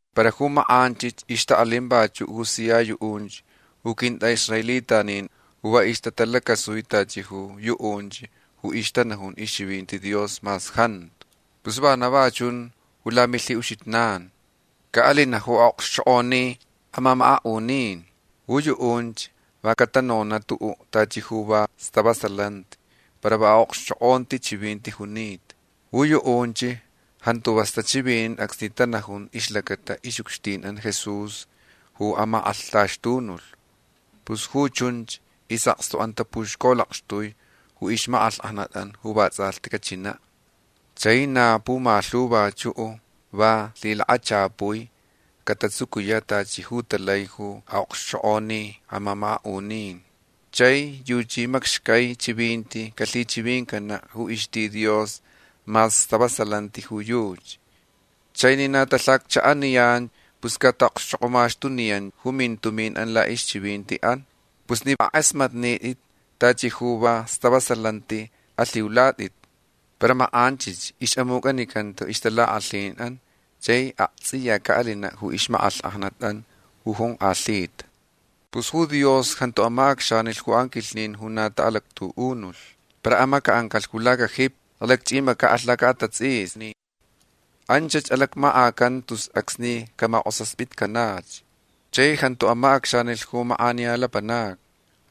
Para ju makʼanchich ixtaʼalin vachuʼ ju sia yuʼunch ju quintʼaʼisraelitanin ju va ixtatalacasui tachi ju yuʼunch ju ixtanajun ixchivinti Dios mas jantu. Pus vana va chun ju lamilhiʼuxijnan. Caʼalinaʼ ju aʼokxchokʼoni amamakaʼunin. Ju yuʼunch va catanonaʼ tuʼuʼ tachi ju va stavasalanti para va aʼokxchokʼonti chivinti junita. Ju yuʼunch jantu vas tachivinin acsni tanajun ixlacata ixʼucxtinʼan Jesús ju amakʼalhtaxtunulh. Pus ju chunch isʼakstuʼan tapuxcolakxtui ju ixmakʼalhkʼajnatʼan ju vatsʼalhti cachinaʼ. Chai na pumalhu vachuʼ va lhilakachapui catatsucuyaʼ tachi ju talai ju aʼokxchokʼoni amamakaʼunin. Chai yuchi macxcai chivinti calhichivincanaʼ ju ixti Dios mas stavasalanti ju yuchi. Chai ni na talhacchaʼaniyan pus cataʼaʼokxchokʼomaxtuniyan ju mintuminʼan laʼixchivintiʼan. Pus ni akʼasmatnitʼit tachi ju va stavasalanti alhiulatʼit. Para makʼanchich ixʼamucʼanicanta ixtalakʼalhinʼan chai aktsʼiya caʼalinaʼ ju ixmakʼalhkʼajnatʼan ju jonkʼalhita. Pus ju Dios jantu amacʼacxanilh ju anquilhnin ju na taʼalactuʼunulh. Para amacaʼancalh ju lacajipi. Alacchʼimacaʼalh lacaʼatatsʼisni. Anchach alacmakʼacanta tus acsni camakʼosaspitcanach. Chai jantu amacʼacxanilh ju makʼaniya lapanacni.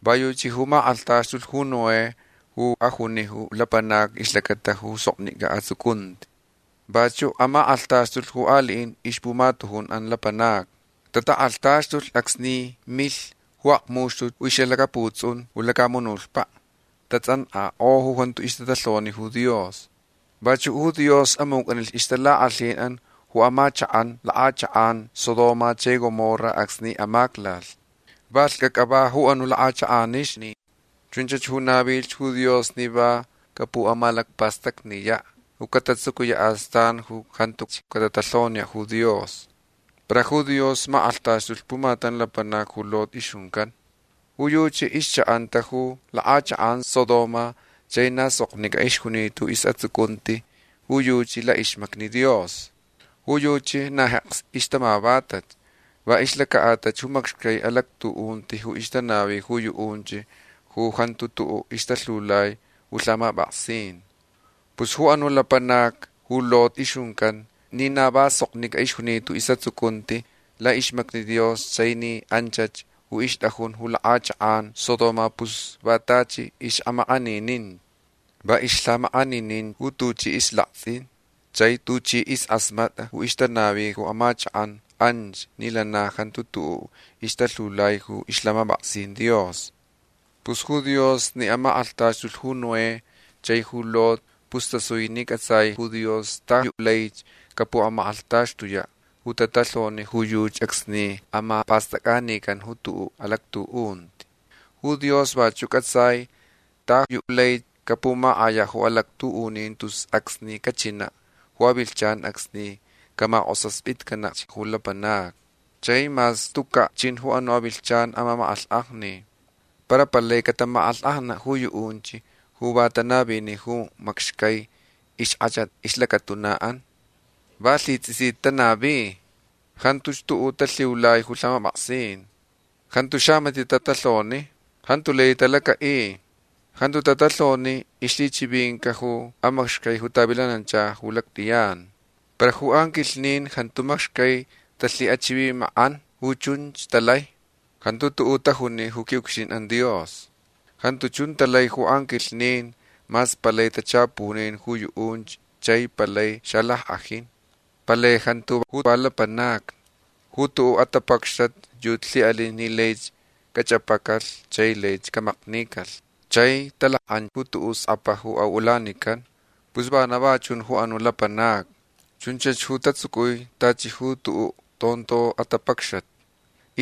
Va yuchi ju makʼalhtaxtulh ju Noé ju ajuni ju lapanacni ixlacata ju soknicʼa atsucunti. Vachuʼ amakʼalhtaxtulh ju aliʼin ixpumatujunʼan lapanacni. Tatakʼalhtaxtulh acsni milh ju akmuxtut ju ixlhilacaputsʼun ju lacamunutpaʼ. Tatsʼankʼakʼo ju jantu ixtatalhoni ju Dios. Vachuʼ ju Dios amucʼanilh ixtalakʼalhinʼan ju amachakʼan lakʼachakʼan Sodoma chai Gomorra acsni amaclalh. Va lhcʼacʼa va ju anuch lakʼachakʼanixni. Chunch ju navilh ju Dios ni va capuʼamalacpastacniyaʼ ju catatsucuyaʼ astan ju jantuch catatalhoniyaʼ ju Dios. Para ju Dios amakʼalhtaxtulh pumatam lapanac ju Lot ixjuncan. Ju yuchi ixchaʼanta ju lakʼachakʼan Sodoma chai na soknicʼa ixjunita ju isʼatsucunti ju yuchi laʼixmacni Dios. Ju yuchi na jeks ixtamavatach va ixlacaʼatalh ju macxcai alactuʼunti ju ixtanavi ju yuʼunch ju jantu tuʼuʼ ixtalhiulai ju lhamapʼaksin. Pus ju anuʼ lapanac ju Lot ixjuncan ni na va soknicʼa ixjunita ju isʼatsucunti laʼixmacni Dios chai ni anch ju ixtʼajun ju lakʼachakʼan Sodoma pus va tachi ixʼamakʼaninin. Va ixlhiʼamakʼaninin ju tuchi islaktsʼin chai tuchi iskʼasmatʼa ju ixtanavi ju amachakʼan anch ni lana jantu tuʼuʼ ixtalhiulai ju ixlhamapʼaksin Dios. Pus ju Dios ni amakʼalhtaxtulh ju Noé chai ju Lot pus tasui ni cʼatsai ju Dios ta yu laich capumakʼalhtaxtuyaʼ ju tatalhoni ju yuchi acsni amapastʼacʼanican ju tuʼuʼ alactuʼunti. Ju Dios vachuʼ cʼatsai ta yu lai capumakʼayaʼ ju alactuʼunin tus acsni cachinaʼ ju avilhchan acsni camakʼosaspitcanach ju lapanacni. Chai mas tucaʼ chin ju anuʼ avilhchan amamakʼalhkʼajni. Para palai catamakʼalhkʼajnanaʼ ju yuʼunch ju va tanavini ju macxcai ixkʼachat ixlacatunaʼan. Va lhitsʼisita tanavi. Jantuch tuʼuʼ talhiulai ju lhamapʼaksin. Jantu xamatiʼ tatalhoni. Jantu lai talacaʼi. Jantu tatalhoni ixlhichivininca ju amacxcai ju tavilanancha ju lactʼiyan. Para ju anquilhnin jantu macxcai talhiʼachivimakʼan ju chunch talai. Jantu tajuni ju quiʼucxtinʼan Dios. Jantu chun talai ju anquilhnin mas palai tachapunin ju yuʼunch chai palai xalackʼajin. Palai jantu ju va lapanacni. Ju tuʼuʼ atapacxat yuchi lhiʼalin ni laich cachʼapacalh chai laich camaknicalh. Chai talakʼan ju tuʼuʼ skʼapa ju aʼulanican. Pus vana va chun ju anuch lapanacni. Chunch ju tatsucui tachi ju tuʼuʼ tonto atapacxat.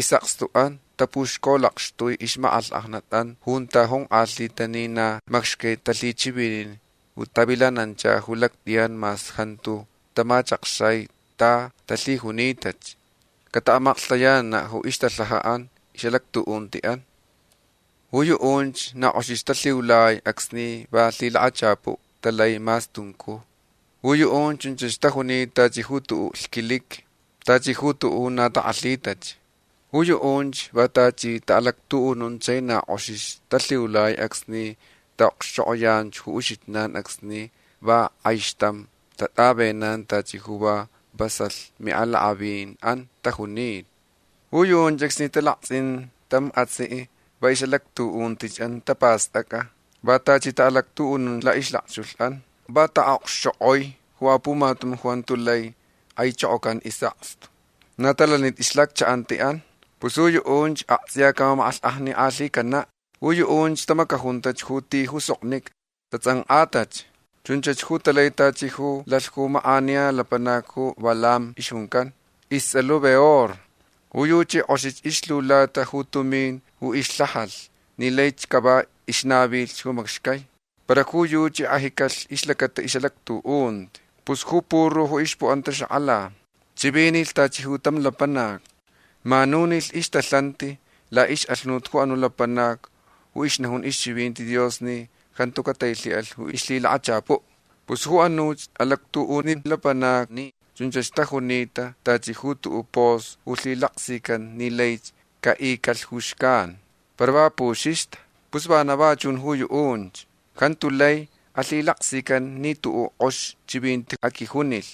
Isʼakstuʼan tapuxcolakxtui ixmakʼalhkʼajnatʼan junta jonkʼalhita ni na macxcai talhichivinin ju tavilanancha ju lactʼiyan mas jantu tamachakxai ta talhijunitach. Cataʼamaklhtayananaʼ ju ixtalhajaʼan ixʼalactuʼuntiʼan. Ju yuʼunch na kʼoxich talhiulai acsni va lhilakachapuʼ talai mas tuncuj. Ju yuʼunch chunch tajunita tachi ju tuʼuʼ lhquiliqui. Tachi ju tuʼuʼ ju na takʼalhitach. Ju yuʼunch va tachi taʼalactuʼunun chai na kʼox talhiulai acsni taʼokxchokʼoyan ju uxijnan acsni va kʼaixtam tatʼavenan tachi ju va vasalh miʼalakʼavinʼan tajunita. Ju yuʼunch acsni talaktsʼin tam atsiʼ va ixʼalactuʼuntiʼan tapastʼacʼa. Va tachi taʼalactuʼunun laʼixlakchulhʼan. Va taʼokxchokʼoi ju apumatam ju jantu lai kʼaichokocan isʼakstu. Na talanitach ixlhacchaʼantiʼan. Pus ju yuʼunch aktsʼiya camamakʼalhkʼajnikʼalhicanaʼ. Ju yuʼunch tamacajuntach ju ti ju soknicʼa. Tatsʼankʼatach. Chunch ju talai tachi ju lalh ju makʼaniya lapanac ju Balaam ixjuncan. Istsʼalh ju Beor. Ju yuchi kʼox ixlhiulata ju tumin ju ixlhajalh ni laich cava ixnavilh ju macxai. Para ju yuchi kʼajicalh ixlacata ixʼalactuʼunti. Pus ju puru ju ixpuʼanta xakʼala. Chivinilh tachi ju tam lapanac. Manunilh ixtalhanti laʼixʼalhunut ju anuʼ lapanac ju ixnajun ixchivinti Dios ni jantu catailhiʼalh ju ixlhilakachapuʼ. Pus ju anuch alactuʼunin lapanacni chunch tajunita tachi ju tuʼuʼ pos ju lhilaksican ni laich caʼicalh ju xcan. Para va puxixta. Pus vana va chun ju yuʼunch. Jantu lai alhilaksican ni tuʼuʼ kʼox chivinti aquijunilh.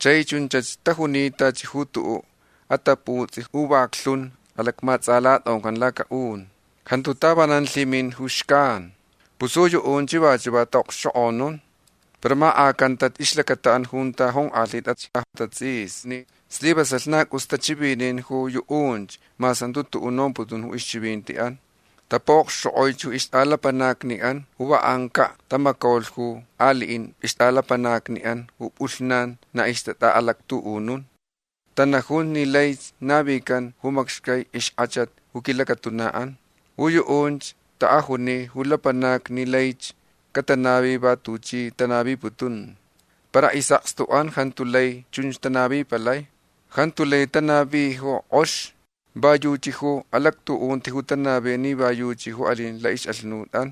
Chai chunch tajunita tachi ju tuʼuʼ ataputsʼi ju vaklhun alacmatsʼalatʼoncan lacaʼun. Jantu tavanan lhimin ju xcan. Pus ju yuʼunch vachuʼ va taʼaʼokxchokʼonun. Para makʼacanta ixlacataʼan junta jonkʼalhitach atatsʼisni. Slivasalh na cʼus tachivinin ju yuʼunch mas jantu tuʼuʼ nomputun ju ixchivintiʼan. Tapuʼokxchokʼoi ju ixtʼalapanacniʼan ju va ancaʼ tamacaulh ju aliʼin ixtʼalapanacniʼan ju pʼulhnan na ixtatʼaʼalactuʼunun. Tanajun ni laich navican ju macxcai ixkʼachat ju quilacatunaʼan. Ju yuʼunch taʼajuni ju lapanacni ni laich catanavi va tuchi tanaviputun. Para isʼakstuʼan jantu lai chunch tanavipalai. Jantu lai tanavi ju kʼox. Va yuchi ju alactuʼunti ju tanavi ni va yuchi ju alin laʼixʼalhunutʼan.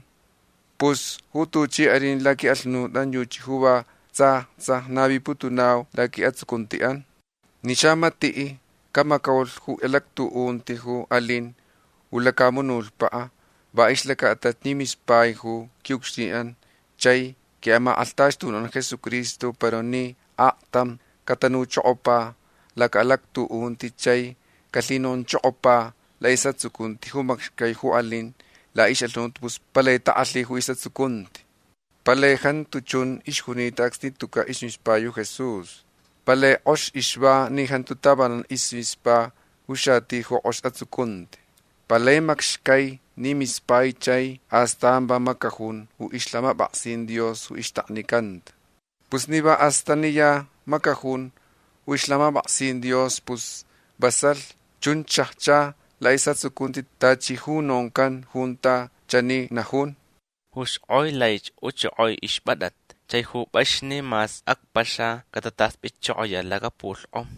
Pus ju tuchi alin laquiʼalhunutʼan yuchi ju va tsa tsa naviputunau laquiʼatsucuntiʼan. Ni xamatiʼ camacaulh ju alactuʼunti ju alin ju lacamunutpaʼ va ixlacaʼatalh ni mispaich ju quiʼucxtinʼan chai quiʼamakʼalhtaxtunuʼan Jesucristo para ni aktam catanuchokopa lacaʼalactuʼunti chai calhinonchokopa laʼisʼatsucunti ju macxcai ju alin laʼixʼalhunut pus palai takʼalhi ju isʼatsucunti. Palai jantu chun ixjunita acsni tucaʼ ismispai ju Jesús. Palai kʼox ixva ni jantu tavanan ismispa ju xati ju kʼox atsucunti. Palai macxcai ni mispaich chai astan va macajun ju ixlhamapʼaksin Dios ju ixtaknicanta. Pus ni va astaniya macajun ju ixlhamapʼaksin Dios pus vasalh chunch xajcha laʼisʼatsucunti tachi ju noncan junta chani najun: “Ju xkʼoi laich uchokoi ixpʼatʼat. Chai ju pʼaxni mas acpaxa catatʼaspitchokoyaʼ lacapulhkʼom”.